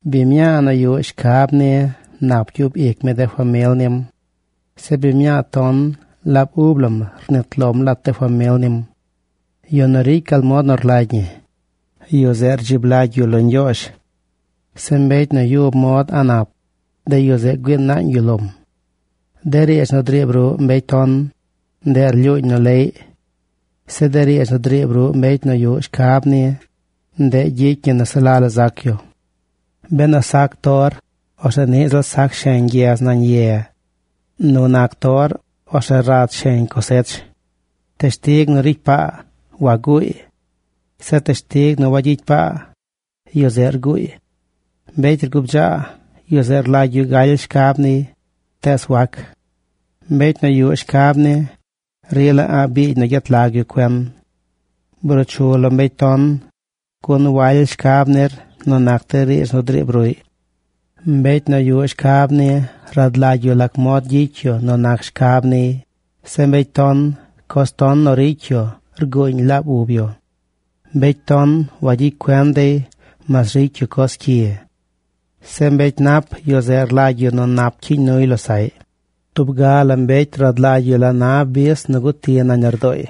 Biñ mñaa nu yuꞌ shcab ni nap gyub ic mi de famil nim. Zeꞌ biñ mñaa ton, laab ub lam rnit lom lat de famil nim. Yu nu ricy gal mod nu rlagy ñi, yu zeꞌ rdzib lagy yu lo Ñgyoozh. Zeꞌ mbecy nu yub mod a̱ꞌ nap, de yu zeꞌ güii naañ yu lom. De riidz nu driib ruꞌ mbecy ton, ndeꞌ rlyuuñ nu leꞌy. Zeꞌ de riidz nu driib ruꞌ mbecy nu yuꞌ shcab ni, ndeꞌ gyicy ñi nu se la la zac yu. Benu sac tor, orzeꞌ niꞌ ziꞌl sac sheñ gyez nañ ye. Nu nac tor, orzeꞌ rad sheñ cosech. Teshtig nu ricy paa, waguuy. Zeꞌ teshtig nu wayicy paa, yu zeꞌ rguuy. Mbecy rgubdzaa, yu zeꞌ rlagy yu galy shcab niy, tees wac. Mbecy nu yuꞌ shcab ni, rila a̱ꞌ biigy nu gyet lag yu cuen. Bruu chu lo mbecy ton, gun waly shcab nir nu nac de riidz nu driib ruꞌy. Mbecy nu yuꞌ shcab ni rad lagy yu lac mod gyicy yu nu nac shcab niy. Zeꞌ mbecy ton, coz ton nu ricy yu rguuñ laab ub yu. Mbecy ton wayicy cuen dey mas ricy yu coz cyi. Zeꞌ mbecy nap, yu zeꞌ rlagy yu nap cyiiñ nuy losaꞌy. Tub ga la mbecy rad lagy yu la na bis nu guti nañ lardooy.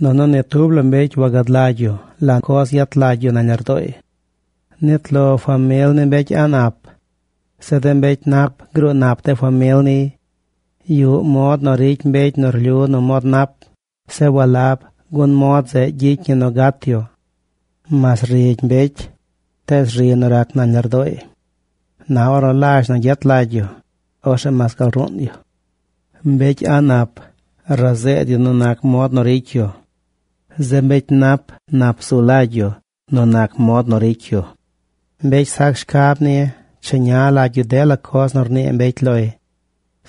Nunu ni tub la mbecy wagad lagy yu la coz yet lagy yu nañ lardooy. Nit lo famil ni mbecy a̱ꞌ nap. Zeꞌ de mbecy nap gruu nap de famil niy. Yuꞌ mod nu ricy mbecy nu rlyu nu mod nap. Zeꞌ walab, gun mod zeꞌ gyicy ñi nu gat yu. Mas rigy mbecy, tees ri nu rac nañ lardooy. Na ornu lazh nu yet lagy yu, orzeꞌ mas gal ruun yu. Mbecy a̱ꞌ nap razeed yu nu nac mod nu ricy yu. Zeꞌ mbecy nap nap zulagy yu nu nac mod nu ricy yu. Mbecy sac shcab ni cheña lagy yu dela coz nu rnii mbecy loy.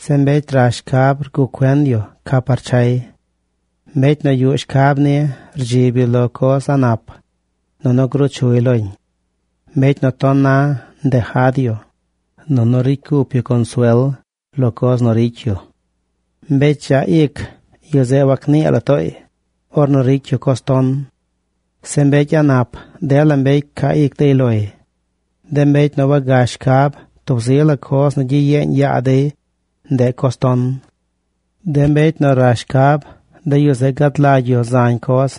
Zeꞌ mbecy rash shcab rguꞌ cuen yu ca par chay. Mbecy nu yuꞌ shcab ni rdzib yu lo coz a̱ꞌ nap, nunu gruu chuy loñ. Mbecy nu ton na ndejad yu, nunu ricy cup yu consuel lo coz nu ricy yu. Mbecy dzaꞌ ic, yu zeꞌ wagnii la tooy ornu ricy yu coz ton. Zeꞌ mbecy a̱ꞌ nap, dela mbecy ca ic dey loy. De mbecy nu wagash shcab, tub zi la coz nu gyiyeeñ yaa dey, ndeꞌ coz ton. De mbecy nu rash shcab, de yu zeꞌ gad lagy yu zañ coz.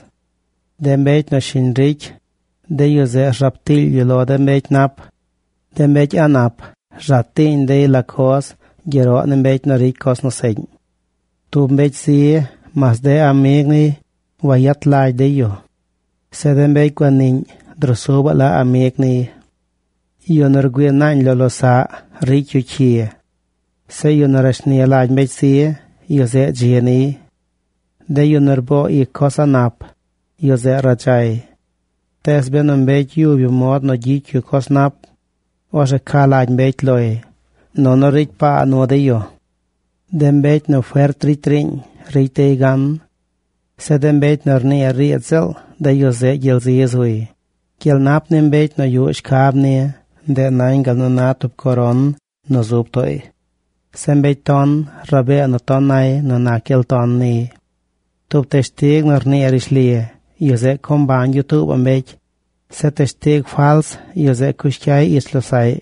De mbecy nu shiñ ricy, de yu zeꞌ rzaab tiily yu lo de mbecy nap. De mbecy a̱ꞌ nap rza tiiñ dey la coz gyeroꞌ ni mbecy nu ricy coz nu seꞌñ. Tub mbecy zi, mas de amig niy wayet lagy dey yu. Zeꞌ de mbecy guaniꞌñ drusubaꞌ la amig niy. Yu nu rgüii naañ lo losaꞌ ricy yu cyi. Zeꞌ yu nu rashni lagy mbecy zi, yu zeꞌ dzi niy. De yu nu rboo ic coz a̱ꞌ nap, yu zeꞌ radzay. Tees benu mbecy yub yu mod nu gyicy yu coz nap, orzeꞌ ca lagy mbecy loy, nunu ricy paa nu dey yu. De mbecy nu fert ricy riiñ, ricy dey gan. Zeꞌ de mbecy nu rnii riidz ziꞌl, de yu zeꞌ gyel zi zuy. Gyel nap ni mbecy nu yuꞌ shcab ni, ndeꞌ nañ gal nu na tub coron nu zub tooy. Zeꞌ mbecy ton rabee nu ton nay nu nac gyel ton niy. Tub teshtig nu rnii rishli, yu zeꞌ co mbañ yu tuubaꞌ mbecy. Zeꞌ teshtig fals, yu zeꞌ cush cyay ich losaꞌy.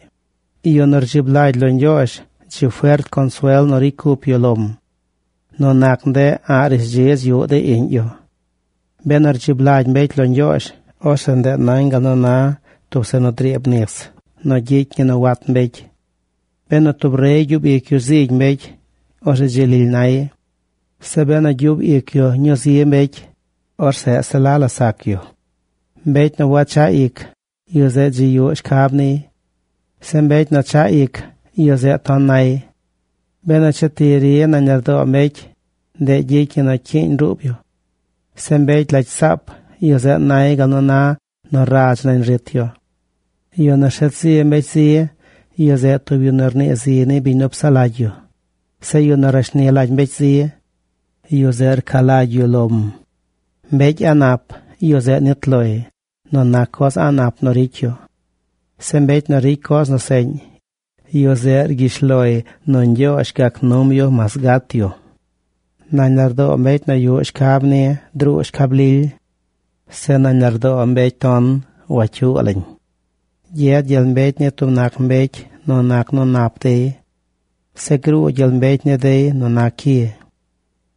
Yu nu rdzib lagy lo Ñgyoozh, dzi fert consuel nu ricy cup yu lom. Nu nac ndeꞌ a̱ꞌ rishdzidz yuꞌ de iꞌñ yu. Benu rdzib lagy mbecy lo Ñgyoozh, orzeꞌ ndeꞌ nañ gal nu na tub zeꞌ nu driib nis nu gyicy ñi nu wat mbecy. Benu tub rey gyub ic yu zigy mbecy, orzeꞌ dzi lily nay. Zeꞌ benu gyub ic yu ñuu zi mbecy, orzeꞌ se la la sac yu. Mbecy nu wachaꞌ ic, yu zeꞌ dzi yuꞌ shcab niy. Zeꞌ mbecy chaꞌ ic, yu zeꞌ ton nay. Benu che ti ri nañ lardoo mbecy, ndeꞌ gyicy ñi nu cyiiñ ruub yu. Zeꞌ mbecy lagy saap, yu zeꞌ nay gal nu na nu radz nañ rit yu. Yu nu rshet zi mbecy zi, yu zeꞌ tub yu nu rnii zi ni biñ nu psaꞌ lagy yu. Zeꞌ yu nu rashni lagy mbecy zi, yu zeꞌ rca lagy yu lom. Mbecy a̱ꞌ nap, yu zeꞌ nit loy nu nac coz a̱ꞌ nap nu ricy yu. Zeꞌ mbecy nu ricy coz nu seꞌñ, yu zeꞌ cyish loy nu Ñgyoozh gac num yu mas gat yu. Nañ lardoo mbecy nu yuꞌ shcab ni druu shcab lily. Zeꞌ nañ lardoo mbecy ton wacyuu lañ. Gyed gyel mbecy ni tub nac mbecy nu nac nu nap dey. Zeꞌ gruu gyel mbecy ni dey nu nac cyi.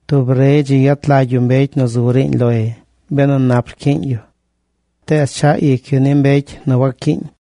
Tub rey dzi yet lagy mbecy nu zu riiñ loy benu nap rcyiiñ yu. Tees chaꞌ ic yu ni mbecy nu waccyiiñ.